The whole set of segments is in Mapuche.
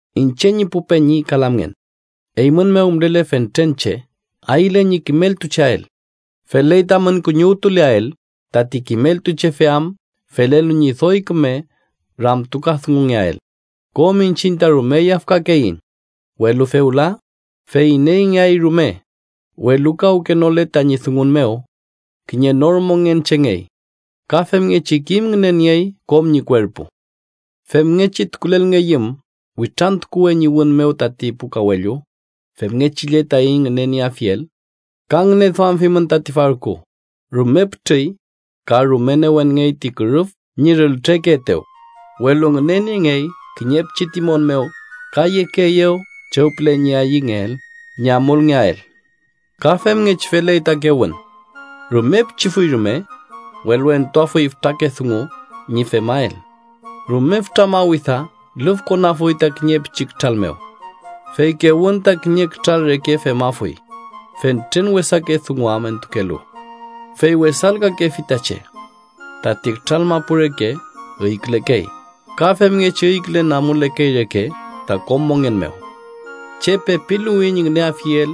Iñche ñi pu peñi ka lamngen, eymün mew mülele fentren che ayüle ñi kimeltucheael, feley tamün kuñiwtuleael tati kimeltuchefe am felelu ñi doy küme ramtukadungungeael. Kom iñchiñ ta rume yafkakeiñ. Welu fewla, fey ineyngeay rume welulkawkenole tañi dungun mew, kiñe nor mongen chengey, ka femngechi kim ngüneniey kom ñi kuerpu. Femngechi tukulelngeyüm witrantukuwe ñi wün mew tati pu kawellu, femngechi lle taiñ ngünenieafiel. Ka ngüneduamfimün tati farku. Rume pütrüy ka rume newenngey ti kürüf ñi rültrekeetew, welu ngüneniengey kiñe pichi timon mew ka yekeeyew chew püle ñi ayüngeel ñi amulngeael. Ka femngechi feley ta kewün. Rume pichifuy rume, welu entuafuy fütrake dungu ñi femael. ¡Rume fütra mawida lüfkonafuy ta kiñe pichi kütral mew! Fey kewün ta kiñe kütral reke femafuy, fentren wesake dungu am entukelu, fey wesalkakefi ta che. Tati kütral mapu reke üykülekey, ka femngechi üykülen amulekey reke ta kom mongen mew. Che pepiluwi ñi ngüneafiel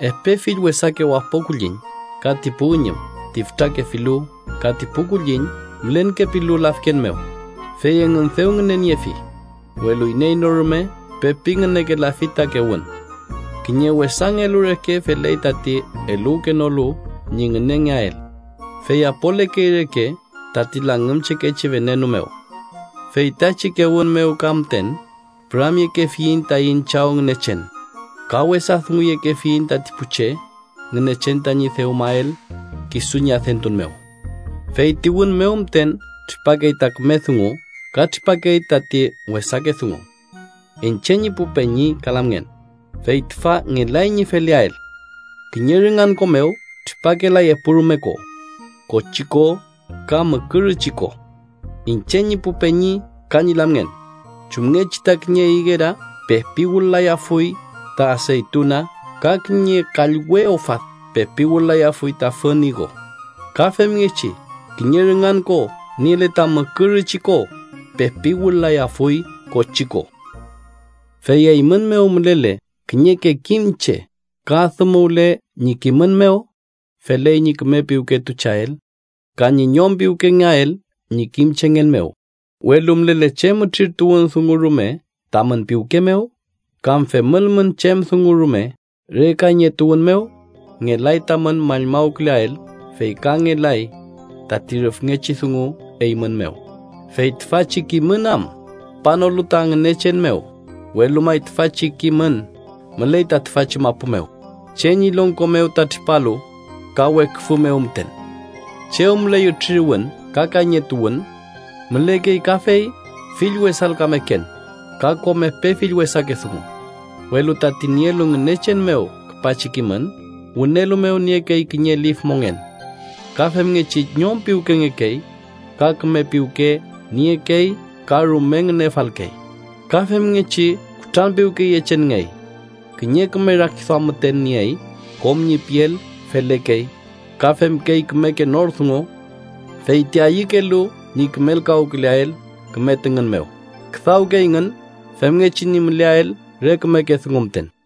epe fill wesake wapo kulliñ ka ti pu üñüm, ti fütrake filu ka ti pu kulliñ mülenkepilu lafken mew. Fey engün dew ngüneniefi, welu iney no rume pepi ngünekelafi ta kewün. Kiñe wesangelu reke feley tati eluwkenolu ñi ngünengeael, fey apolekey reke tati langümchekechi venenu mew. Feytachi kewün mew ka müten püramyekefiyiñ taiñ Chaw Ngünechen, ka wesa dunguyekefiyiñ tati pu che Ngünechen tañi dewmael kisu ñi adentun mew. Feyti wün mew müten tripakey ta küme dungu ka tripakey tati wesake dungu. Iñche ñi pu peñi ka lamngen, fey tüfa ngelay ñi feleael. Kiñe rünganko mew tripakelay epurume ko: kochü ko ka mükürüchi ko. Iñche ñi pu peñi ka ñi lamngen, chumngechi ta kiñe igera pepi wül-layafuy ta aseytuna ka kiñe kallwe ofad pepi wül-layafuy ta fün igo, ka femngechi kiñe rünganko niele ta mükürüchi ko, pepi wül-layafuy kochü ko. Fey eymün mew mülele kiñeke kim che ka adümuwle ñi kimün mew, feley ñi küme piwketucheael, ka ñi ñom piwkengeael ñi kim chengen mew. Welu mülele chem ütrirtuwün dungu rume tamün piwke mew, kam femülmün chem dungu rume re kayñetuwün mew, ngelay tamün mallmawküleael fey ka ngelay tati rüfngechi dungu eymün mew. Fey tüfachi kimün am küpanolu ta Ngünechen mew, welu may tüfachi kimün müley ta tüfachi mapu mew, che ñi longko mew ta tripalu ka weküfü mew müten. Chew müley ütrirüwün ka kayñetuwün, mülekey kafey fill wesalkameken ka kom epe fill wesake dungu. Welu tati nielu Ngünechen mew küpachi kimün, wünelu mew niekey kiñe lif mongen. Ka femngechi ñom piwkengekey, ka küme piwke niekey ka rume ngünefalkey. Ka femngechi kutranpiwkeyenchengey, kiñe küme rakiduam müten niey, kom ñi piel felekey, ka femkey kümeke nor dungu. Feyti ayükelu ñi kümelkawküleael, küme tüngün mew küdawkeyngün femngechi ñi müleael re kümeke dungu müten.